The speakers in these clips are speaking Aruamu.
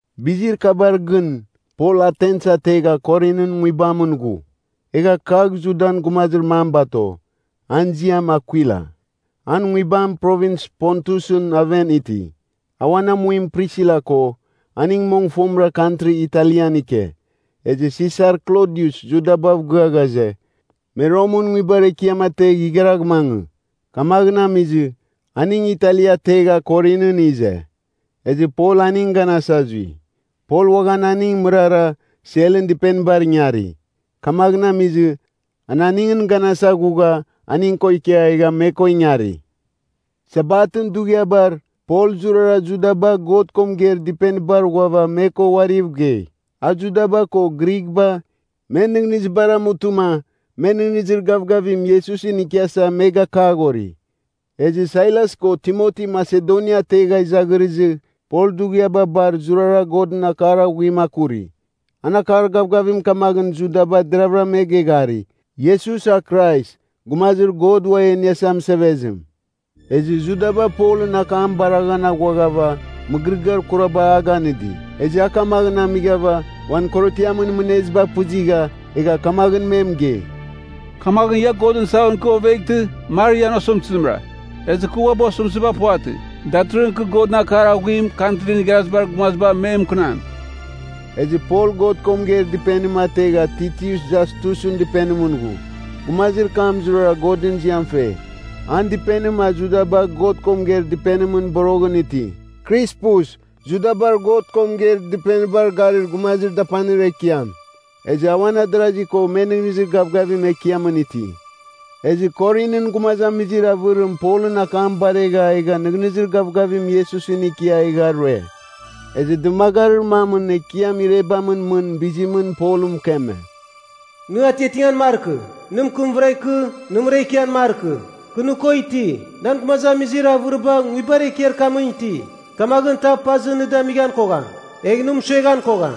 Bizir kabar gɨn, Pol Atens ategha Korinɨn nguibamɨn ghu. Egha kagh Judan gumazir mam bato, an ziam Akwila. An nguibam Provins Pontusɨn aven iti. A uan amuim Prisila ko, aning mong fomɨra kantri Italian ike, ezɨ Sisar Klodius Judabav gɨa ghaze, me Romɨn nguibar ekiam ategh igharagh mangɨ. Kamaghɨn amizɨ, aning Italia ategha Korinɨn ize. Ezɨ Pol aning ganasa zui. Pol uaghan aning mɨrara, selɨn dɨpenibar ingari. Kamaghɨn amizɨ, an aningɨn ganasa ghugha, aning ko ikia egha me ko ingari. Sabatɨn dughiabar, Pol zurara Judaba God ko mɨgeir dɨpenibar ghuava me ko uariv gei. A Judaba ko Grighba, men nɨghnɨzibar amutɨma, me nɨghnɨzir gavgavim Iesusɨn ikiasa me gakaghori. Ezɨ Sailas ko Timoti Masedonia ategha izaghirizɨ, Pol dughiaba bar zurara Godɨn akar aghuim akuri. An akar gavgavim kamaghɨn Judaba deravɨra me geghari, Iesus a Krais, Gumazir God Uam E Iniasa Mɨsevezim. Ezɨ Judaba Polɨn akam baraghan aghuaghava, mɨgɨrɨgɨar kuraba a ganɨdi. Ezɨ a kamaghɨn amighava, uan korotiamɨn mɨneziba pɨzigha, egha kamaghɨn me mɨgei, “Kamaghɨn ia Godɨn saghon ikɨ oveghtɨ, mar ian osɨmtɨzimra. Ezɨ kɨ uabɨ osɨmtɨziba puvatɨ. Datɨrɨghɨn kɨ Godɨn akar aghuim Kantrin Igharazibar Gumaziba me mɨkɨnam.” Ezɨ Pol God ko mɨgeir dɨpenim ategha Titius Jastusɨn dɨpenimɨn ghu. Gumazir kam zurara Godɨn ziam fe. An dɨpenim a Judaba God ko mɨgeir dɨpenimɨn boroghɨn iti. Krispus, Judabar God ko mɨgeir dɨpenibar garir gumazir dapanir ekiam. Ezɨ a uan adarasi ko me nɨghnɨzir gavgavim Ekiamɨn iti. Ezɨ Korinɨn gumazamizir avɨrim Polɨn akam baregha egha nɨghnɨzir gavgavim Iesusɨn ikia egha rue. Ezɨ dɨmagarir mamɨn Ekiam irebamɨn mɨn bizimɨn Polɨn mɨkeme, “Nɨ atiatingan markɨ; nɨ mɨkɨmvɨra ikɨ; nɨmɨra ikian markɨ. Kɨ nɨ ko iti, nan gumazamizir avɨriba nguibar ekiar kamɨn iti. Kamaghɨn tav pazɨ nɨ damighan koghan, egh nɨ mɨsueghan kogham.”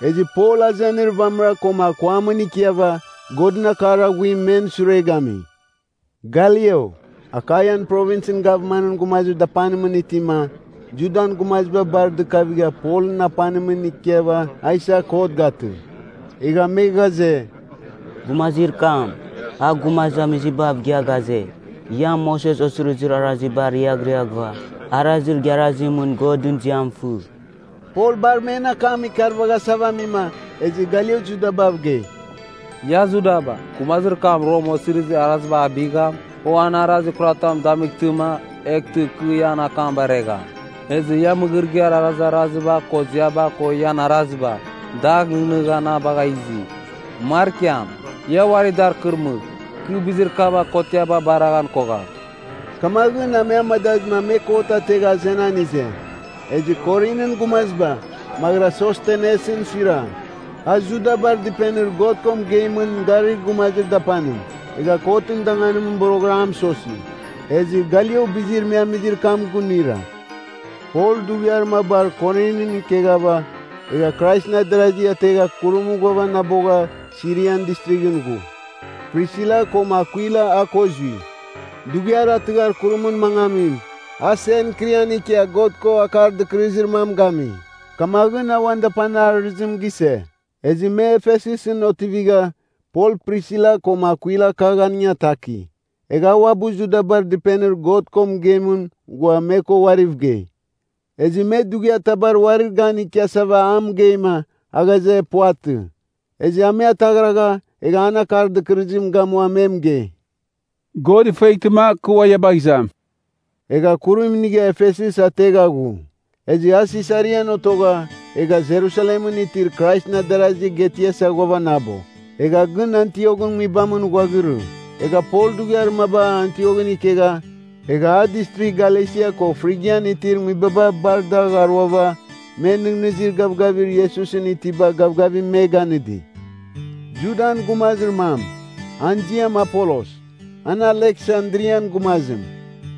Ezɨ Pol azenir vamɨra koma akuamɨn ikiava, Godɨn akar aghuim men sure gami. Galio, Akaian Provinsɨn gavmanɨn gumazir dapanimɨn itima, Judan gumaziba bar dɨkavigha Polɨn apanimɨn ikiava a isa kot gatɨ. Egha me ghaze, “Gumazir kam, a gumazamizibav gɨa ghaze, ‘Ia Moses Osirizir Araziba riaghriaghɨva, arazir igharazimɨn Godɨn ziam fɨ.’” Pol bar men akam ikarvaghasava amima, ezɨ Galio Judabav gei, “Ia Judaba, gumazir kam Rom osirizir araziba abigham, o an arazir kuratam damightɨma, eghtɨma kɨ ian akam baregham. Ezɨ ia mɨgɨrɨgɨar arazaraziba ko ziaba ko ian araziba, dagh nɨghnɨgha na bagha izi. Markiam. Ia uari dar kɨrmɨgh. Kɨ bizir kabar kotiaba bareghan kogham.” Kamaghɨn a me amadazɨma me kot ategha azenan ize. Ezɨ Korinɨn gumaziba, maghɨra Sostenesɨn suira, a Judabar dɨpenir God ko mɨgeimɨn garir gumazir dapanim, egha kotɨn danganim boroghɨra a mɨsosi. Ezɨ Galio bizir me amizir kam gunuira. Pol dughiar mabar Korinɨn ikeghava, egha Kraisɨn adarasi ategha kurim ghuavanabogha Sirian Distrighɨn ghu. Prisila koma Akwila a ko zui. Dughiar a tɨghar kurimɨn mangamim, a Senkrian ikia God ko akar dɨkɨrɨzir mam gami. Kamaghɨn a uan dapanir arɨzim gise. Ezɨ me Efesus otivigha, Pol Prisila koma Akwila kagh aning ataki. Egha a uabɨ Judabar dɨpenir God ko mɨgeimɨn ghua me ko uariv gei. Ezɨ me dughiar tabar uarir gan ikiasava a mɨgeima, a ghaze, Puvatɨ. Ezɨ a me ataghragha, egha an akar dɨkɨrɨzim gamua me mɨgei, “God ifueghtɨma, kɨ ua ia bagh izam.” Egha kurim inigha Efesus ategha ghu. Ezɨ a Sisarian otogha, egha Jerusalemɨn itir Kraisɨn adarazi getiasa ghuavanabo. Egha gɨn Antioghɨn nguibamɨn ghuaghirɨ. Egha Pol dughiar mabar Antioghɨn ikegha, egha a Distrigh Galesia ko Frigian itir nguibaba bar dagh aruava, men nɨghnɨzir gavgavir Iesusɨn itiba gavgavim me ganɨdi. Judan gumazir mam, an ziam Apolos, an Aleksandrian gumazim.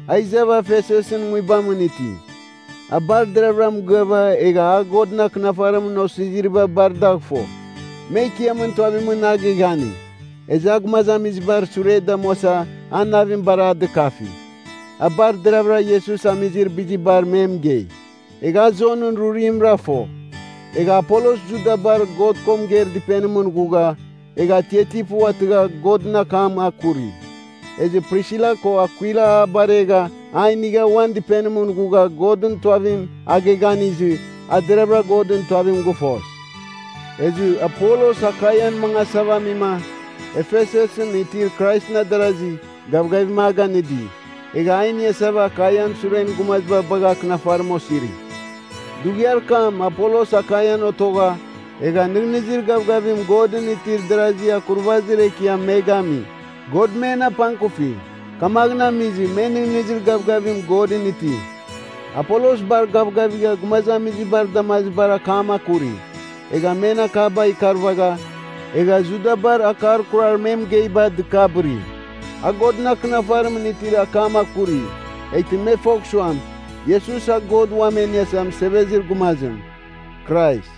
A izava Efesusɨn nguibamɨn iti. A bar deravɨra mɨgɨava egha a Godɨn Akɨnafarimɨn Osiziriba bar dagh fo. Me Ekiamɨn tuavimɨn a geghani, ezɨ a gumazamizibar sure damuasa an navim bar a dɨkafi. A bar deravɨra Iesus amizir bizibar me mɨgei. Egha a Jonɨn rurimra fo. Egha Apolos Judabar God ko mɨgeir dɨpenim ghugha, egha atiati puvatɨgha Godɨn akam akuri. Ezɨ Prisila ko Akwila a baregha a inigha uan dɨpenimɨn ghugha Godɨn tuavim a geghanizɨ, a deravɨra Godɨn tuavim gɨfos. Ezɨ Apolos Akaian mangasava amima, Efesusɨn itir Kraisɨn adarazi, gavgavim a ganɨdi, egha a iniasava Akaian suren gumaziba bagha akɨnafarim osiri. Dughiar kam Apolos Akaian otogha, egha nɨghnɨzir gavgavim Godɨn itir darasi akurvazir ekiam me gami. God men apangkuvifi, kamaghɨn amizɨ me nɨghnɨzir gavgavim Godɨn iti. Apolos bar gavgavigha gumazamizibar damazibar akam akuri, egha men akaba ikarvagha, egha Judabar akar kurar me mɨgeiba dɨkabɨri. A Godɨn Akɨnafarimɨn itir akam akuri, eghtɨ me fogh suam, Iesus a God Uam E Iniasa Mɨsevezir Gumazim, Krais.